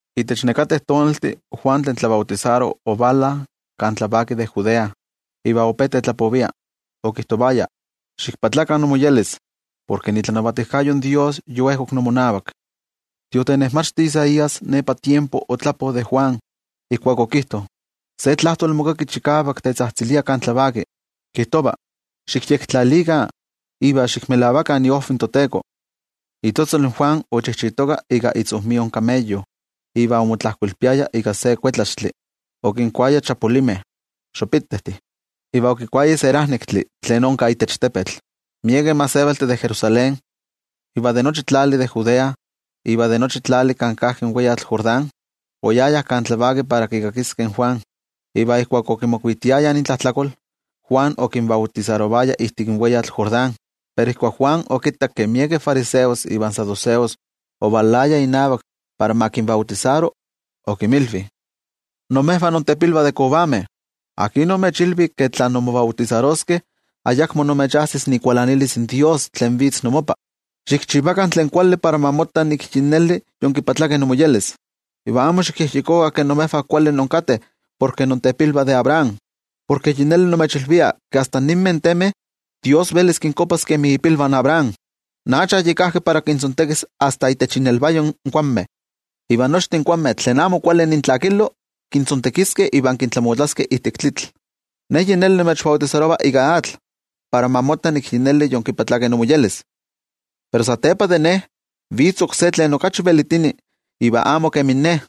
Itech nekateh tonaltih, Juan tlen tlabautisaro ovala kan tlavaki de Judea, iva ope tetlapovia. Okijtovaya: —Ximoyolkuapakah, porke itlanavatijkayo in toYejwatzi yoejkok imonavak. In tiotenejmachti Isaías nepa tiempo otlapo de Juan, ijkuak okijto: Se tlajtoli mokaki chikavak tetzajtzilia kan tlavaki, kijtova: “Xikyektlalikah iva xikmelavakah iojviv in toTeko.” Itzotzol in Juan ochijchitoka ika itzojmio kameyo, iva omotlajkoilpiaya ika se kuetlaxtli. Okinkuaya chapulimeh iva okikuaya serajnektli tlen onka itech tepetl. Miekeh gentejtih de Jerusalén, iva de nochi tlali de Judea iva de nochi tlali kan kajki in weyatl Jordán, oyayah kan tlavaki para kikakiskeh in Juan. Iva ijkuak okimokuitiayah intlajtlakol, Juan okinbautisarovaya ijtik in weyatl Jordán. Pero ijkuak Juan okittak ke miekeh fariseos ivan saduceos ovalayah inavak para ma kinbautisaro, okinmilvi: —¡Imejvah intepilvah de kovameh! ¿Akin omechilvi ke tla inmobautisaroskeh ayakmo imechajsis ikualanilis in toYejwatzi tlen vitz inmopa? Xikchivakah tlen kuali para ma motta nik yi neli yonmoyolkuapkeh, iva amo xikyejyekokah ke imejvah kuali inkateh porke intepilvah de Abraham. Porke yi neli nimechilvia ke asta ninmeh temeh toYejwatzi velis kinkuapas kemi ipilvah in Abraham. In acha yi kajki para kintzontekis asta itech innelvayo in kuanmeh, iva nochtin kuanmeh tlen amo kuali intlakilo kintzontekiskeh iva kintlamotlaskeh ijtik tlitl. Ne yi neli nimechbautisarova ika atl para ma motta nik yi neli yonmoyolkuapkeh. Pero satepa de ne, vitz oksé tlen okachi velitini iva amo kemin ne,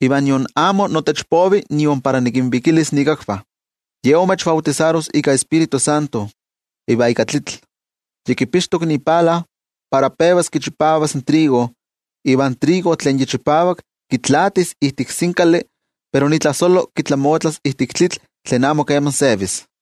iva nion amo notech povi nion para nikinvikilis ikakvah. Ye imechbautisaros ika Tioijyotzintli iva ika tlitl. Yi kipixtok ipala para pevas kichipavas in trigo. Iva in trigo tlen yi chipavak kitlaatis ijtik sinkali, pero itlajsolo kitlamotlas ijtik tlitl tlen amo keman sevis.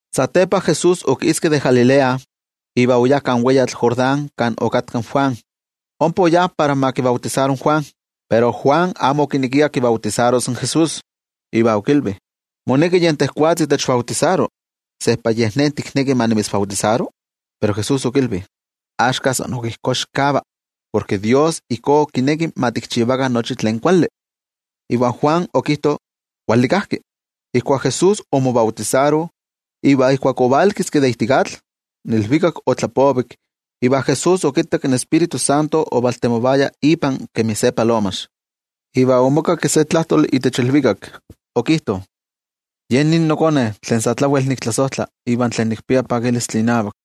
Satepa Jesús okiski de Galilea iva oyá kan weyatl Jordán kan okatka in Juan, ompa oyá para ma kibautisaro in Juan. Pero Juan amo okinekia kibautisaros in Jesús, iva okilvi: —Moneki yen tejwatzi techbautisaro. ¿Sejpa yej ne tikneki ma nimitzbautisaro? Pero Jesús okilvi: —Axka san ok ijkó xikava, porke Dios ijkó kineki ma tikchivakah nochi tlen kuali. Iva Juan okijto kuali kajki. Ijkuak Jesús omobautisaro iva ijkuak ovalkiski de ijtik atl, in ilvikak otlapovik iva Jesús okittak in Tioijyotzintli ovaltemovaya ipa kemi se palomax. Iva omokakki se tlajtoli itech ilvikak, okijto: —Ye nin noKone tlen sa tlawel niktlasojtla, iva tlen nikpia pakilistli inavak.